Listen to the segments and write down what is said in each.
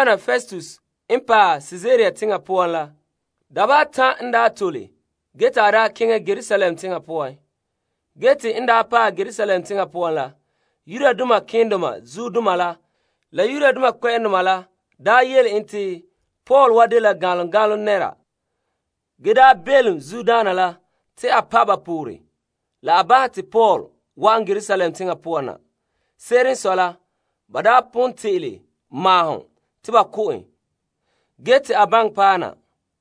Festus n paɛ Kaesarea teŋa la dabeha atan', te en tole ge te a keŋɛ la Yerusalem teŋa poan. Te malema keendoma la Yudoma kpɛ'ɛndoma la daa yele en te Paul wa dela ganlom ganlom nɛra ge belom Festus la te a pa' ba pore, la a bahɛ te Paul wa'an Yerusalem teŋa poan na. Se'ere n sɔe la, ba daa pon te'ele maahom te ba ko' en ge te a baŋɛ paɛ na.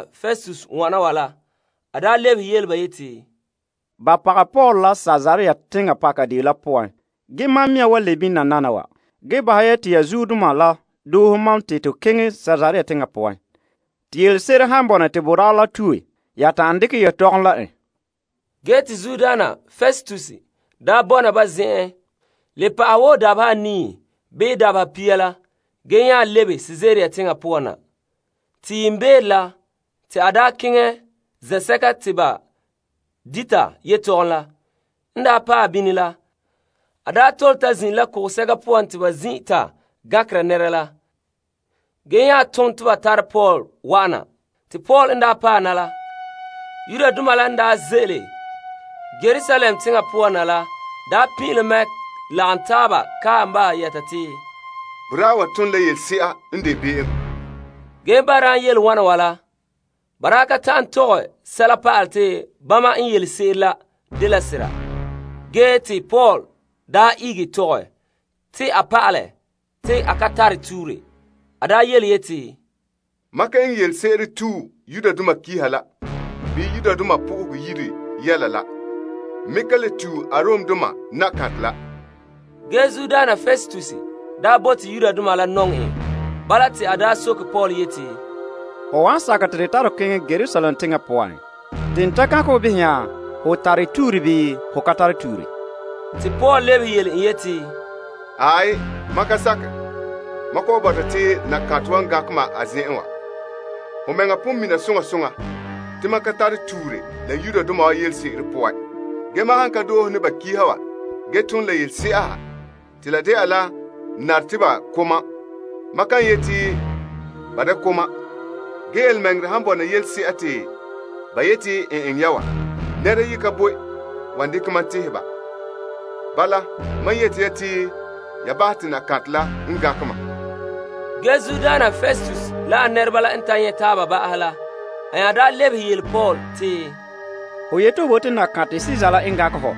Festus lebehe yele ba yeti, Ba pagɛ Paul la Kaesarea teŋa pakadeen la poan. Ge mam mea wan lebe bini nananawa. Bahɛ ya te ya zuodoma la doohe mam te to keŋɛ Kaesarea teŋa poan te yelese'ere n han bɔna te boraa la tue, ya ta'an dekɛ yetɔgom la en. Festus n ta bɔna ba zen'en le pa'ahɛ wo dabeha anii bii dabeha pia la, te a nya lebe Kaesarea teŋa poan na. Te yiimbeere la, a keŋɛ zen'sɛka te ba dita yetɔgom la. En tole ta zin'ire la kugusɛka poan te ba zin'inra gankera nɛra la, ge nya tom yete ba tare Paul wa'an na. Paul n paɛ na la, Yudoma la n daa ze'ele Yerusalem teŋa poan na la pin'ilom mɛ lagom taaba kae en bahɛ yɛta te a ton la yelese'a n de be'em ge ba ka ta'an tɔgɛ sɛla pa'alɛ te bama n yelese'ere la dela sera. Ge te Paul ihege tɔgɛ te a pa'alɛ te a ka tare tuure yeti, Mam ka eŋɛ yelese'ere tue Yudoma pa'alegɔ la bii Yenɛ Yire yɛla la. N me ka le tue Kaesar la. Ge Festus daa bote Yudoma la nɔŋɛ en. Bala te a soke Paul yeti, Ho wan sakɛ te to tare ho keŋɛ Yerusalem teŋa poan, te n ta gankɛ ho behɛ nya ho tare tuure bii ho ka tare tuure? Paul lebehe en yeti, Aai, mam ka sakɛ. Mam kɔ'ɔn bɔta te Kaesar wa n gankɛ ma a zen'en wa. Ho mɛŋa pon mina soŋa soŋa te ma ka tare tuure la Yudoma wa yelese'ere poan. Ge mam han tom la yelese'a ha te la de'a la n nare te ba ko' mam, mam kan yeti te ba da ko' mam. Ge yelemɛŋɛrɛ han bɔna yelese'a te ba yeti n eŋɛ ya wa, nɛra yi ka boe wan dekɛ mam tehɛ ba. Bala, bahɛ te Kaesar la n gankɛ ma! Festus la a nɛreba la n nya ta nyɛ' taaba ba'ahɛ la, a lebehe yele Paul te, Ho yete ho bote Kaesar la n gankɛ hɔ.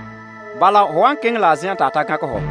Bala ho wan keŋɛ la Kaesar la zen'en te a gankɛ hɔ.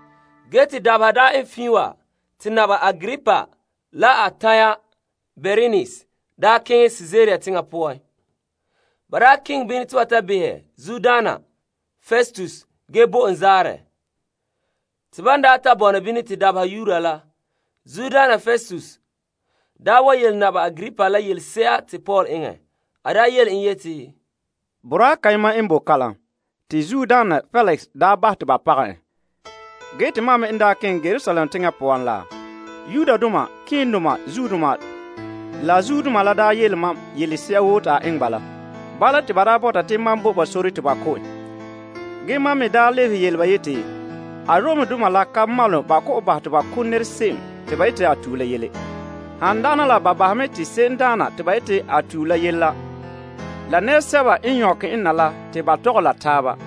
Ge te dabeha daa eŋɛ fiin wa, te Naba Agripa la a tanya Bernise daa keŋɛ Kaesarea teŋa poan te ba ta behɛ Festus ge bo en zaarɛ. Te ban daa ta bɔna bini te dabeha yuura la, Zuodaana Festus daa wa yele Naba Agripa la yelese'a te Paul eŋɛ, yeti, Boraa kayema n bo kalam te Feliks daa bahɛ te ba pagɛ en. Mam me n daa keŋɛ Yerusalem teŋa poan la, malema keendoma la zuodoma la daa yele ma yelese'a woo te a eŋɛ ba la bɔta te mam bo sore te ba ko' en. Mam lebehe yele ba te Aromdoma la ka maalom ba kɔ'ɔn bahɛ te ba ko' nɛrese'em te ba yete a tue la yele, han dagana la ba bahɛ mɛ te se'emdaana te ba yete a tue la yele la la nɛresɛba n nyɔkɛ en na la te ba tɔgɛ la taaba.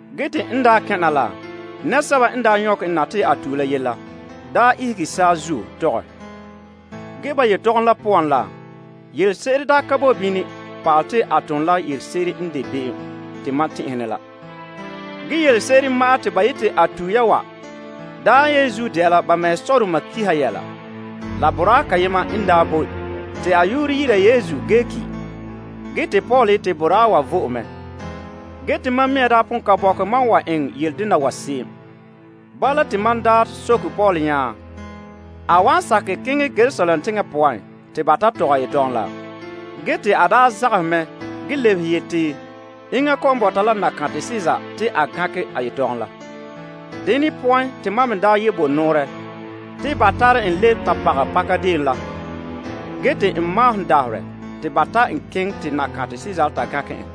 En daa kɛn' na la, nɛresɛba n daa nyɔkɛ en te a tue la yele la, daa ihege saazuo tɔgɛ. Ge ba yetɔgom la poan la, yelese'ere daa ka bo bini pa'alɛ te a ton la yelese'ere n de be'em te mam tɛn'ɛhe ne la. Yelese'ere ma'an te ba yete a tue ya wa daa yenzuo de'a la ba mɛhe sɔdoma kiha yɛla la boraa kayema n daa boe te a yu'urɛ dɛna Yesu ge ki', ge te Paul yete boraa wa vɔe mɛ. Te mam mea daa pon ka bɔkɛ mam wan eŋɛ yele dena wa se'em. Bala te mam daa soke boraa la nya a wan sakɛ keŋɛ Yerusalem teŋa poan te ba tɔgɛ a yetɔgom la. Ge te a daa zagahɛ mɛ ge lebehe yete enŋa kɔ'ɔn bɔta la Kaesar te a gankɛ a yetɔgom la. Dene poan te mam me daa bo nɔɔrɛ te ba tare en le ta pagɛ pakadeen la ge te n maahom dabaherɛ te a keŋɛ te Kaesar la ta gankɛ en.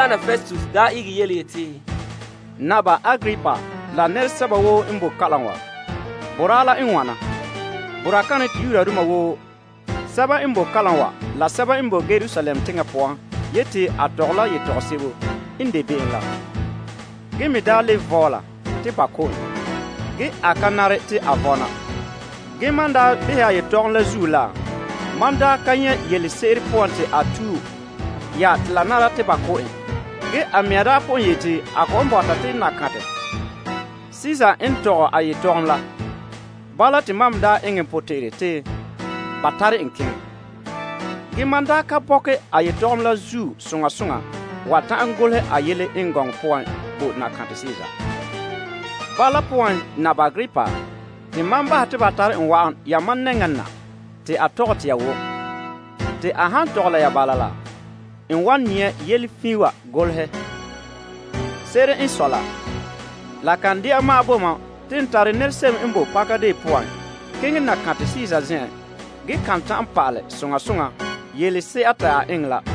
Festus nya ihege yeti, Naba Agripa la nɛresɛba woo n bo kalam wa, boraa la n wana te Yudoma woo sɛba n bo kalam wa la sɛba n bo Yerusalem teŋa poan yete a tɔgɛ la yetɔgom sebo n de be'em la ge me daa le vɔla te ba ko' en ge a ka nare te a vɔna. Ge mam daa behɛ yetɔgom la zuo la, mam daa ka nyɛ' yelese'ere poan te a tue ya te la nara te ba ko' en. Ge a mea daa pon yete a kɔ'ɔn bɔta te Kaesar n tɔgɛ a yetɔgom la. Bala te mam me eŋɛ n potɛn'ɛrɛ te ba tare en keŋɛ. Ge mam ka bɔkɛ yetɔgom la zuo soŋa soŋa wa ta'an golehɛ a yele eŋɛ gɔŋɔ poan bo Kaesar. Bala poan, Naba Agripa, te mam bahɛ te ba tare en na yamam nɛŋa na te a tɔgɛ te ya wom te a han tɔgɛ la ya bala, n wan nyɛ' yele fiin wa golehɛ. Se'ere n sɔe la, la kan de'a ma'an bo mam te n tare se'em n bo pakadeen poan keŋɛ Kaesar zen'en ge ka ta'an pa'alɛ soŋa soŋa yelese'a te a eŋɛ la.